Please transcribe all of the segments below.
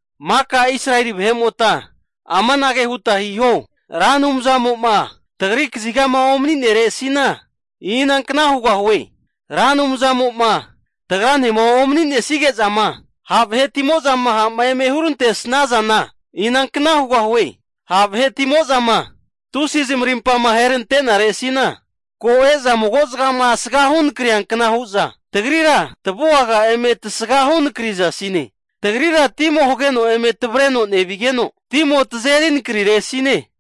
Maka Israeli vahe'mota amanage huta hiho. Ra Anumzamo'ma tagri kazigama omani'neresina, inankna hugahie? Ra Anumzamo'ma tagranema omani'nesige'zama ha' vahetimo'zama ha'ma eme hurantesnazana inankna hugahie? Ha' vahetimo'zama tusi zamarimpama aherante'naresina, ko e'za magozagama asgahu nakriankna hu'za tagrira eme tavuaga tasgahu nakrizasine. Tagrira timo hageno eme tavreno nevigeno, timo tazeri nakariresine.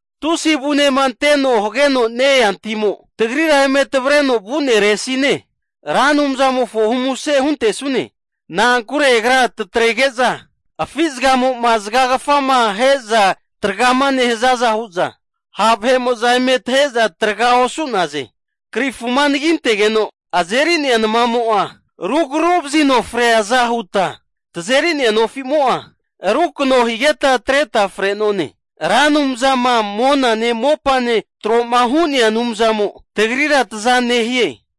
Tusi avunema anteno hageno nea timo, tagrira eme tavreno vu'neresine. Ra Anumzamofona humuse huntesanune. Na'ankure agra tatrege'za afi zagamo'zama zagagafama ahe'za tragama nehazaza hu'za, ha' vahe'mo'za eme tahe'za traga osu'naze. Krifuma anagintegeno azeri'nea namamo'a rugraru'vazino freaza huta, tazeri'nea nofimo'a rukano higeta atreta fre'none. Ra Anumzama monane mopane tro'ma hu'nea Anumzamo tagrira taza nehie.